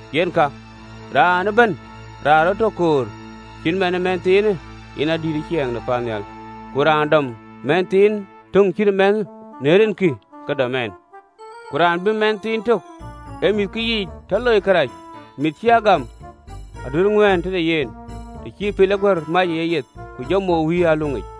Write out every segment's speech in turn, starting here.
Yen ka, raan ëbɛ̈n raan ë rɔt tɔ koor cït man ë mɛnhthiinë, yen adït ë ciɛɛŋ de paannhial. Ku raan dɔm mɛnhthiin töŋ cït ëmɛnhë në rinkï, ke dɔm ɛn, “Ku raan bï mɛnh tök ë mïththiikë yiic tɔ loi kërac, mïth cï a gam, aduëër ŋuän tëde yen, të cï pil ë guär mac ë yeyeth, ku jɔ mou wïïr ë aluŋic.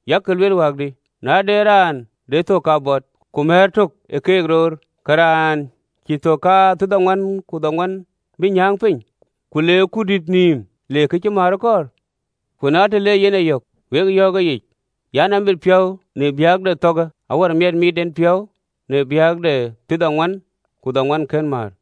Yak lueel wäkdï? Na de raan de thök kabɔt, ku mär tök ë keek roor, ke raanë cïï thök kathiërdhoŋuan ku dhoŋuan bï nyääŋ piny, ku le ë kurdït nïïm, le kë cï määr kɔɔr? Ku na të le yen e yök, wek yɔ̈ɔ̈k ëyic an, “Abï piɔ̈u miɛt në biäk de thɔ̈ɔ̈kë awär miɛt mit en piɔ̈u në biäk de thiërdhoŋuan ku dhoŋuan kën määr.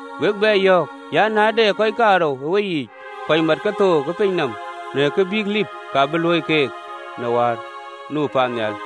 Wek bɛ yɔ̈ɔ̈k an, “Na de kɔc kaarou ë weyiic kɔc mat kethook ë piny nɔm, në kë bïk lim, ka bï luöi keek në wäär nu paannhial.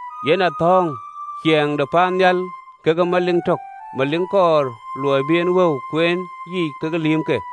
Yen athɔ̈ŋ ciɛɛŋ de paannhial kekë melik tök, melik kɔɔr luɔi bï en wëu kueen yiic kekë lïïmke.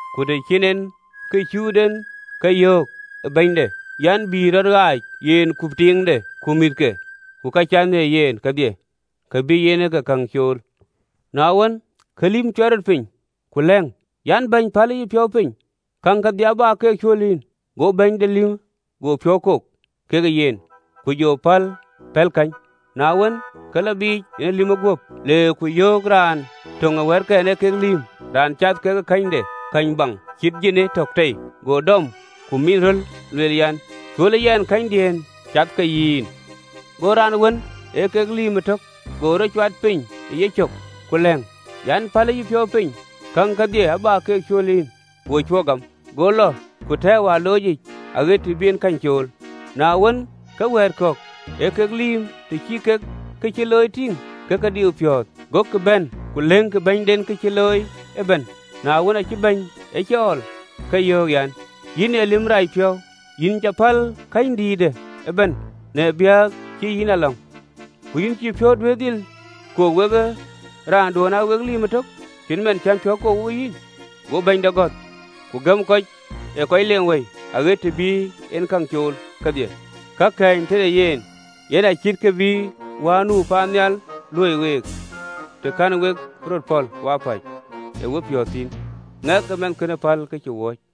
Ku të cïn en ke cut en, ke yöök ë bɛ̈nyde an, ‘Bï rɔt ɣaac, yen ku tiiŋde ku mïthke, ku ka cath në yen kedhie, ka bï en ke käŋ cool.’ Na wën, ke lïmë cuɛt rɔt piny, ku lɛ̈ŋ an, “Bɛ̈ny, pälë yïpiɔ̈u piny, käŋ kedhie abä ke cuöl yïn.” Go bɛ̈ny de lïmë go piɔ̈u kok kekë yen, ku jɔ pɔ̈l, pɛ̈l kanu. Na wën, ke lɔ biic, yen ee lïmë guöp, le ku yök raan töŋ ë wɛ̈ɛ̈tkɛn ee kek lïïm, raan cath ke känyde, käny baŋ, cït jini tök tei, go dɔm, ku min röl, lueel an, “Cuölë yɛn känydiën cath ke yïn.” Go raan wën ee kek lïïm ëtök go rɔt cuat piny ë yecök, ku lɛ̈ŋ an, “Pälë yïpiɔ̈u piny, käŋ kedhie abä ke cuöl yïn.” Go cuö gam, go lɔ ku tɛ̈ɛ̈u ë aloocic, aɣët të bï yen käny cool. Na wën, ke wɛ̈ɛ̈t kɔ̈k ee kek lïïm, të cï kek kë cï looi tïŋ, ke ke diu piɔ̈ɔ̈th, gokï bɛ̈n ku lëkkï bɛ̈nyden ka cï looi ëbɛ̈n. Na wën, aacï bɛ̈ny e cɔɔl, ke yöök an, “Yïn ee lïm racpiɔ̈u, yïn cä päl ee känydïïtë ëbɛ̈n, në biäk cï yïn a lɔ̈ŋ. Ku yïn, cïï piɔ̈u duëër dhil kok wekë raanduön aa wek lïïm ëtök, cït man cän piɔ̈u kok wokë yïn?’ Go bɛ̈nyde gɔ̈th, ku gëm kɔc ë kɔc leeŋ wëi, aɣët të bï en käŋ cool kedhie, ka kɛ̈ɛ̈ny tëde yen.” Yen acït kë bï wäär nu paannhial luöi week, të kɛ̈n we röt pɔ̈l wapäc ë wepiɔ̈ɔ̈th thïn, ŋɛk ë mɛnhkënë päl ka cï wööc.